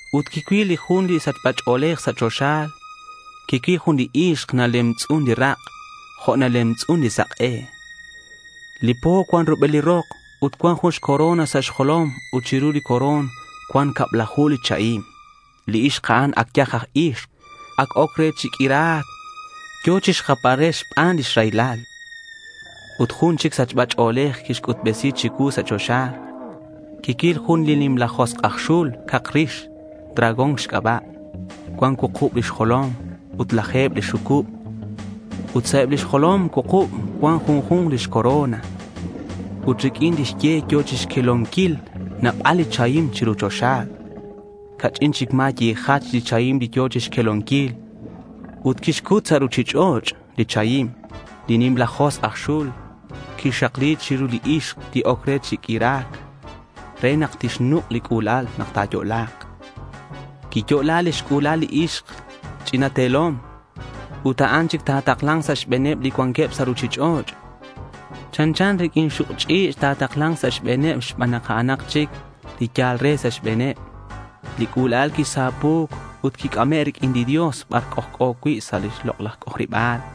Ut quicuil jun li sachba ch'o̱lej sa' choxa. Quicuil jun li ixk. Nalemtz'un li rak' jo' nalemtz'un li sak'e. Li po cuan rubel rok ut cuan jun corona sa' xjolom ut chiru li corona cuan cablaju li chahim. Li ixk a'an yaj aj ixk. Ac oc re chi q'uira̱c. Yo̱ chixjapbal re xban lix raylal. Ut jun chic sachba ch'o̱lej quic'utbesi̱c chicuu sa' choxa. Quicuil jun nimla josk' aj xul cak rix dragón xc'aba'. Cuan cuukub lix jolom ut laje̱b lix xucub. Ut sa' eb lix jolom cuukub cuan junju̱nk lix corona. Ut riq'uin lix ye yo̱ chixquelonquil nabal li chahim chiru choxa. Ca'ch'in chic ma̱ yijach li chahim li yo̱ chixquelonquil. Ut quixcut sa' ruchich'och' li chahim. Li nimla josk' aj xul quixakli chiru li ixk li oc re chi q'uira̱c re nak tixnuk' li c'ula'al nak ta̱yo'la̱k. Quiyo'la lix c'ula'al li ixk ch'ina te̱lom. Ut a'an chic ta̱takla̱nk sa' xbe̱neb li cuanqueb sa' ruchich'och'. Chanchan riq'uin li xuk' ch'i̱ch' ta̱takla̱nk sa' xbe̱neb xban nak a'anak chic li yal re sa' xbe̱neb. Li c'ula'al quisapu̱c ut quic'ame' riq'uin li Dios bar c'ojc'o cui' sa' lix lok'laj c'ojariba̱l.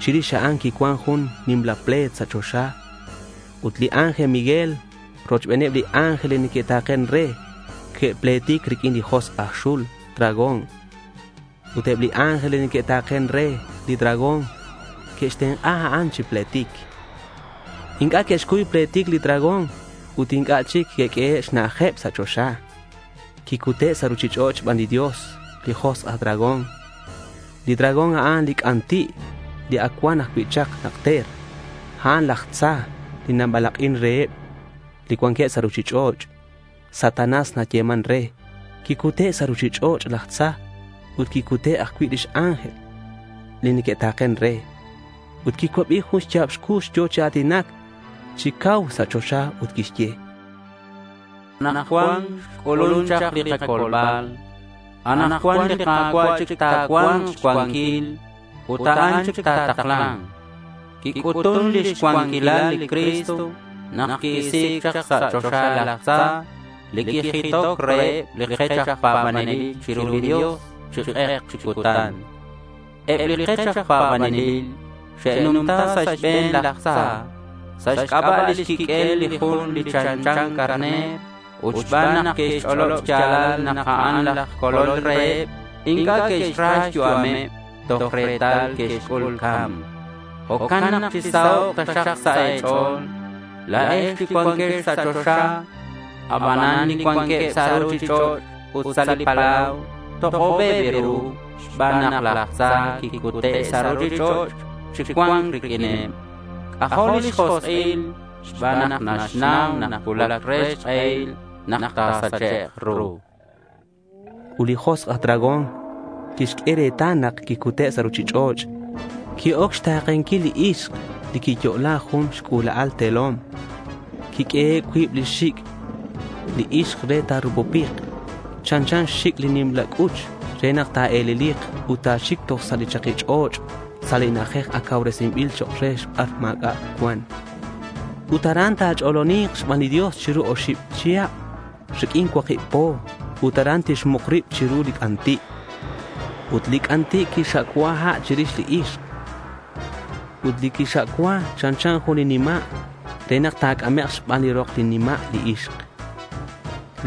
Chirix a'an quicuan jun nimla ple̱t sa' choxa ut li ángel Miguel rochbeneb li ángel li neque'ta̱ken re que'pletic riq'uin li josk' aj xul dragón. Ut eb li ángel li neque'ta̱ken re li dragón que'xtenk'a a'an chi pletic. Inc'a' que'xcuy pletic li dragón ut inc'a' chic que'q'uehe' xna'ajeb sa' choxa. Quicute' sa' ruchich'och' xban li Dios li josk' aj dragón. Li dragón, a'an li c'anti' li ac cuan ajcui' chak najter. A'an laj tza li nabalak'in reheb li cuanqueb sa' ruchich'och'. Satanás nayeman re. Quicute' sa' ruchich'och' laj tza ut que'cute' ajcui' li ángel li que'ta̱ken re. Ut quicuabi jun xya̱b cux yo̱ chi a̱tinac chi cau sa' choxa ut quixye: —Anakcuan xc'ulun chak li kacolbal. Anakcuan li Ka̱cua' chic ta̱cua̱nk xcuanquil ut a'an chic ta̱takla̱nk. Quic'utun lix cuanquilal li Cristo nak qui-isi̱c sa' choxa laj tza li quijitoc reheb li kech aj pa̱banelil chiru li Dios chi k'ek chi cutan. Eb li kech aj pa̱banelil xe'numta sa' xbe̱n laj tza sa' xc'aba' lix quiq'uel li Jun li chanchan carner ut xban nak que'xch'olob xya̱lal nak a'an laj Colol reheb. Inc'a' que'xra xyu'ameb, toj retal que'xc'ul ca̱mc. Jo'can nak chisahok' taxak sa' e̱ch'o̱l la̱ex li cuanquex sa' choxa. Abanan li cuanqueb sa' ruchich'och' ut sa' li palau tok'obeb ru xban nak laj tza quicute' sa' ruchich'och' chi cua̱nc riq'uineb. C'ajo' lix josk'il xban nak naxnau nak cuulac re xk'ehil nak ta̱sachek' ru, chan. Ut li josk' aj dragón quixq'ue retal nak quicute' sa' ruchich'och'. Qui-oc xta̱kenquil li ixk li quiyo'la jun xc'ula'al te̱lom. Quiq'uehe' cuib lix xic' li ixk re ta̱rupupik chanchan xxic' li nimla c'uch re nak ta̱e̱lelik ut ta̱xic toj sa' li chaki ch'och' sa' li na'ajej ac cauresinbil chok' re bar ma̱c'a' cuan. Ut aran ta̱ch'oloni̱k xban li Dios chiru oxib chihab riq'uin cuakib po. Ut aran tixmuk rib chiru li c'anti'. Ut li c'anti' quixxa'cua' ha' chirix li ixk. Ut li quixxa'cua' chanchan jun nima' re nak ta̱c'amek' xban li rok li nima' li ixk.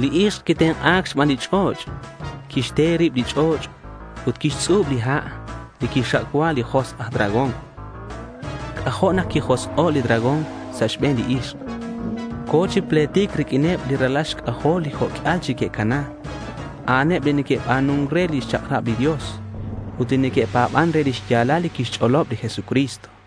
Li ixk quitenk'a̱c xban li ch'och'. Quixte rib li ch'och' ut quixtz'ub li ha' li quixxa'cua' li josk' aj dragón. C'ajo' nak quijosk'o' li dragón sa' xbe̱n li ixk. Co̱ chi pletic riq'uineb li ralal xc'ajol, li jo' q'uial chic que'cana. A'aneb li neque'ba̱nun re lix chak'rab li Dios ut neque'pa̱ban re li xya̱lal li quixch'olob li Jesucristo.